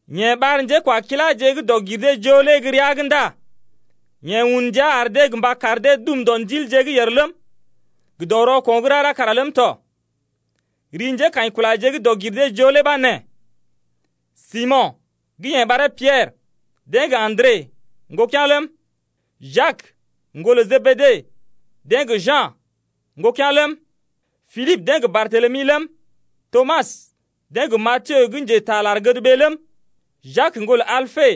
Yeḛ ɓar njékwakiláje gə́ dɔg-gir-dee-joo lé gə́ rəa’g ndá yeḛ un ndia ar dee gə mba kar dee dum dɔ ndilje gə́ yèr ləm, gə dɔ rɔko̰ gə́ rara kara ləm tɔ. Ri njékaḭkulaje gə́ dɔg-gir-dee-joo lé ɓa nee: Simo̰, gə́ yeḛ ɓaree Piɛrə, deḛ gə Andre, ŋgokea̰ ləm, Jak, ŋgolə Jebede, deḛ gə Ja̰, ŋgokea̰ ləm, Pilibə deḛ gə Bartelemi ləm, Tomas deḛ gə Matiyo gə́ njetaa lar-gədɓee ləm, Jak ŋgolə Alpe,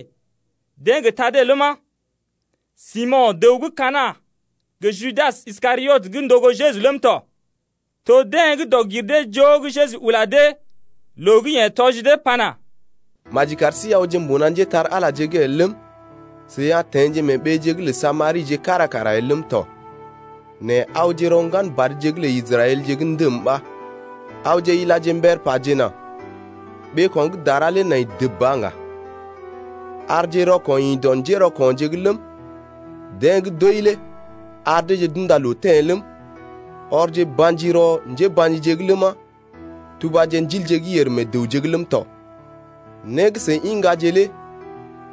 deḛ gə Tade ləma, Simo̰ dəw gə́ Kana̰ gə Judas Iskariot gə́ ndogo Jeju ləm tɔ. To deḛ gə́ dɔg-gir-dee-joo gə́ Jeju ula dee, loo gə́ yeḛ tɔji dee pana: Maji kar sí awje mbuna njépole-magəje el ləm, seḭ a teḛje mee ɓeeje’g lə Samarije kára kara el ləm tɔ. Nɛ awje rɔ ŋgan badje lə Israɛlje gə́ ndəm ɓa. Awje ilaje mbər pajena: Ɓeeko̰ gə́ dara lé nai dəb ba ŋga. Arje rɔko̰ ḭ dɔ njérɔko̰je’g ləm, deḛ gə́ d’wəi lé ar deeje d’unda loo teḛ ləm, ɔrje ba̰ji rɔ njéba̰jije’g ləma, tubaje ndilje gə́ yèr meḛ dəwje’g ləm tɔ. Né gə́ seḭ iŋgaje lé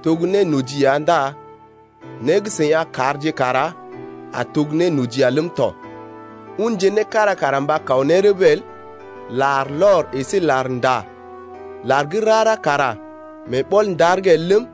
to gə́ nénoji ya ndá né gə́ seḭ a karje kara a to gə́ nénoji ya ləm tɔ. Unje né kára kara mba kaw ne rəbə el, larlɔr əsé larnda əsé lar gə́ rara kara mee ɓɔl-ndar’g el ləm,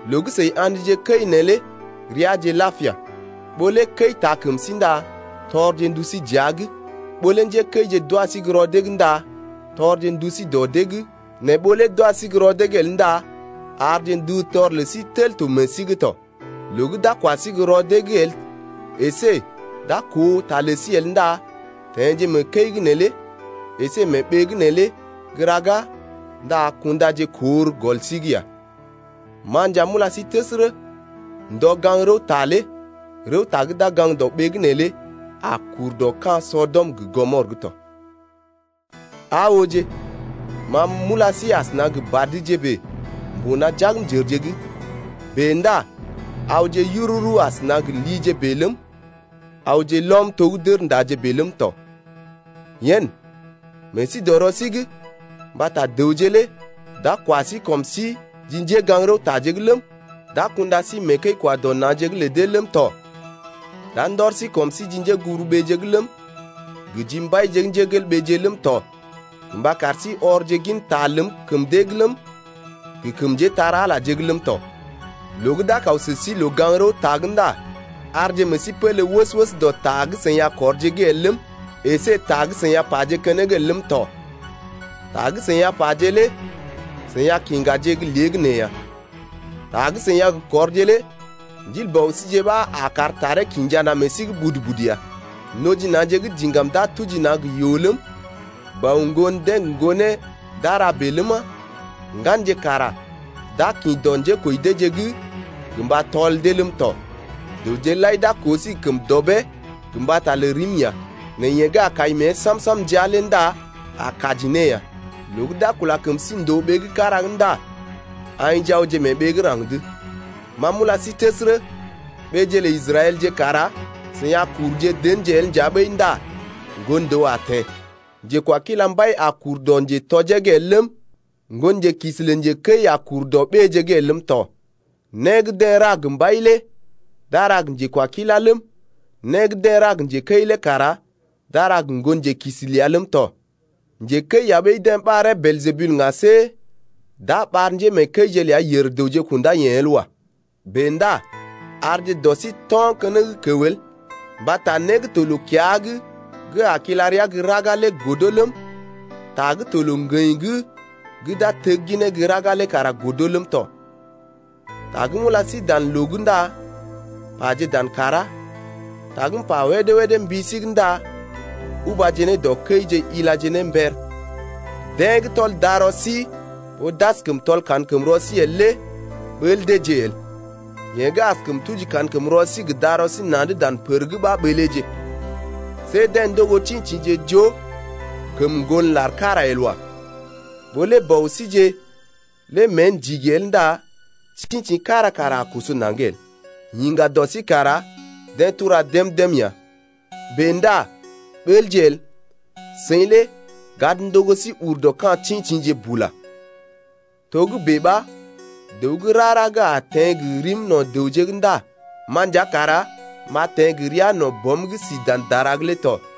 Loo gə́ seḭ a̰dje kəi neelé reaje lapia. Ɓó lé kəi taa kəm sí ndá tɔrje ndu sí dəa’g, ɓó lé njékəije d’wa sí gə́ rɔ dee’g ndá tɔrje ndu sí dɔ dee’g, nɛ ɓó lé d’wa sí gə́ rɔ dee’g el ndá arje ndutɔr lə sí tel to meḛ sí’g tɔ. Loo gə́ d’a kwa sí gə́ rɔ dee’g el əsé d’a koo ta lə sí el ndá teḛje mee kəi’g neelé əsé mee ɓee’g neelé gə́ ɗaga ndá kundaje kor gɔl sí’g ya. Ma nja m’ula sí təsərə, ndɔ gaŋg-rəwta lé rəwta gə́ d’a gaŋg dɔ ɓee’g neelé a kur dɔ ka̰ Sɔdɔm gə Gɔmɔr tɔ. Aa ooje, m’ula sí asəna gə badje bèe mbuna jagmjərje’g. Bèe ndá awje yururu asəna gə lije bèe ləm, awje lɔm to gə́ dərndaje bèe ləm tɔ. Yen, meḛ sí dɔ rɔ sí’g mbata dəwje lé d’a kwa sí kɔm sí ji njégaŋ-rəwtaje’g ləm, d’a kunda sí mee kəi-kwa-dɔ-na̰je’g lə dee ləm tɔ. D’a ndɔr sí kɔm sí ji njéguburuɓeeje’g ləm, gə ji mbaije ləm tɔ gə mba kar sí ɔrje ginta ləm kəm dee’g ləm, gə kəm njépole-magəje’g ləm tɔ. Loo gə́ d’a kaw sə sí loo-gaŋg-rəwta’g ndá arje meḛ sí pélé wəs-wəs dɔ ta gə́ seḭ a kɔrje’g el ləm, əsé ta gə́ seḭ a paje keneŋ el ləm tɔ. Ta gə́ seḭ a paje lé seḭ a kiŋgaje gə́ léegəneeya. Ta gə́ seḭ a gə kɔrje lé Ndil Bɔ síje ɓa a kar taree kinja na̰ meḛ sí’g budu-budu ya. Noji na̰je gə́ diŋgam d’a tuji na̰ gə yoo ləm, bɔ ŋgon deḛ gə ŋgonee d’a ra bèe ləma, ŋganje kara d’a kḭ dɔ njékoji deeje’g gə mba tɔl dee ləm tɔ. Dəwje lai d’a koo sí gə kəm dɔbee gə mbata lə rim ya, nɛ yeḛ gə́ a kai mée sam-sam ndá ndəa lé a kaji ne ya. Loo gə́ d’a kula kəm sí ndòo ɓee gə́ kára’g ndá aḭje awje mee ɓee gə́ raŋg’d. Ma m’ula sí təsərə, ɓeeje lə Israɛlje kara seḭ a kuruje denje el nja ɓəi ndá Ŋgon-dəw a teḛ. Njekwakila mbai a kur dɔ njetoje’g el ləm, ŋgonjelookisi lə njekəi a kur dɔ ɓéeje’g el ləm tɔ. Né gə́ deḛ ra gə mbai lé d’a ra gə njekwakilá ləm, né gə́ deḛ ra njekəi lé kara d’a ra gə ŋgonjelookisi ləa ləm tɔ. Njekəi ya ɓəi deḛ ɓaree Beeljebul ŋga see d’a ɓar njémeekəije ləa yèr-dəwje kundá yeḛ el wa. Bèe ndá arje dɔ sí to̰ keneŋ kəw el, mbata né gə́ to loo-kiya’g gə́ a lal kila rəa gə́ raga lé godo ləm, ta gə́ to loo-ŋgəḭ’g gə́ d’a tegginee gə́ raga el lé kara godo ləm tɔ. Ta gə́ m’ula sí dan loo’g ndá paje dan kàrá, ta gə́ m’pa wédé-wédé mbi sí’g ndá ubaje ne dɔ kəije ilaje ne mber. Deḛ gə́ tɔl darɔ sí ɓó d’askəm tɔl kankəmrɔ sí el lé ɓəl deeje el. Yeḛ gə́ askəm tuji kankəmrɔ sí gə darɔ sí na̰’d dan pər’g ɓa ɓəleeje. See deḛ ndogo tḭtḭje joo kəm sisi el wa. Ɓó lé bɔ síje lé mée ndigi el ndá tḭtḭ kára kara a koso naŋg el. Yiŋga dɔ sí kara deḛ tura dém-dém ya. Bèe ndá ɓəlje el, seḭ lé gad ndogo sí ur dɔ ka̰ tḭtḭje bula. Togə́bè ɓa dəw gə́ rara gə́ a teḛ gə rim no̰ dəwje’g ndá ma nja kara m’a teḛ gə ria no̰ Bɔm gə́ si dan dara’g lé tɔ.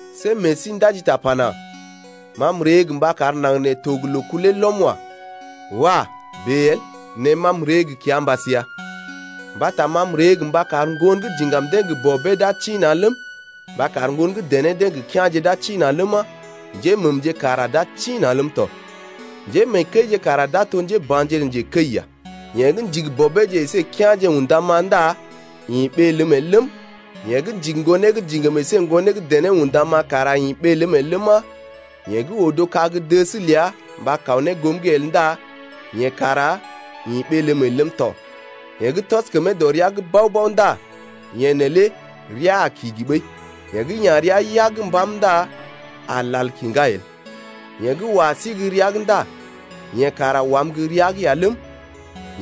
See meḛ sí ndaji ta pana: Ma m’ree gə mba kar naŋg nee to gə loo kulee lɔm wa. Wah, bèe el. Nɛ ma m’ree gə kiambas ya. Mbata ma m’ree gə mba kar ŋgon gə́ diŋgam deḛ gə bɔbeeje d’a tḭ-na̰ ləm, mba kar ŋgon gə́ dené deḛ gə kea̰je d’a tḭ-na̰ ləma, njéməmje kara d’a tḭ-na̰ ləm tɔ. Njémeekəije kara d’a to njéba̰je lə njekəi ya. Yeḛ gə́ ndigi bɔbeeje əsé kea̰je undam-ma ndá ḭ ɓee ləm el ləm, yeḛ gə́ ndigi ŋgonee gə́ diŋgam əsé ŋgonee gə́ dené undam-ma kara ḭ ɓee ləm el ləma, yeḛ gə́ odo kag-dəs ləa mba kaw ne goom’g el ndá yeḛ kara ḭ ɓee ləm el ləm tɔ. Yeḛ gə́ tɔs kəmee dɔ rəa’g bao-bao ndá yeḛ neelé rəa a kigi ɓəi. Yeḛ gə́ ya̰ rəa yag gə́ mbam ndá a lal kiŋgá el. Yeḛ gə́ wa sí gə́ rəa’g ndá yeḛ kara wam gə́ rəa’g ya ləm,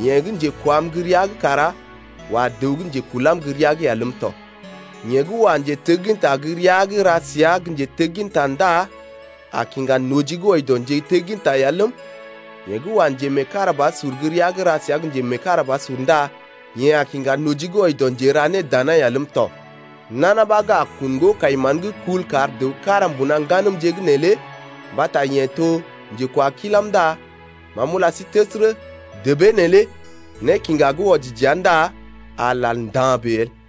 yeḛ gə́ njekwam gə́ rəa’g kara wa dəw gə́ njekulam gə́ rəa’g ya ləm tɔ. Yeḛ gə́ wa njetegginta gə́ rəa’g ra səa gə́ njetegginta ndá a kiŋga noji gə́ wɔji dɔ njetegginta ya ləm, yeḛ gə́ wa njemeekarabasur gə́ rəa’g ra səa gə́ njemeekarabasur ya ndá yeḛ a kinja noji gə́ wɔji dɔ njera nédana ya ləm tɔ. Nana ɓa gə́ a kun ŋgo-kai-mán gə́ kul kar dəw kára mbuna ŋganəmje’g neelé mbata yeḛ to njekwakilam ndá ma m’ula sí təsərə, debee neelé nékiŋga gə́ wɔji dəa ndá a lal nda̰ bèe el.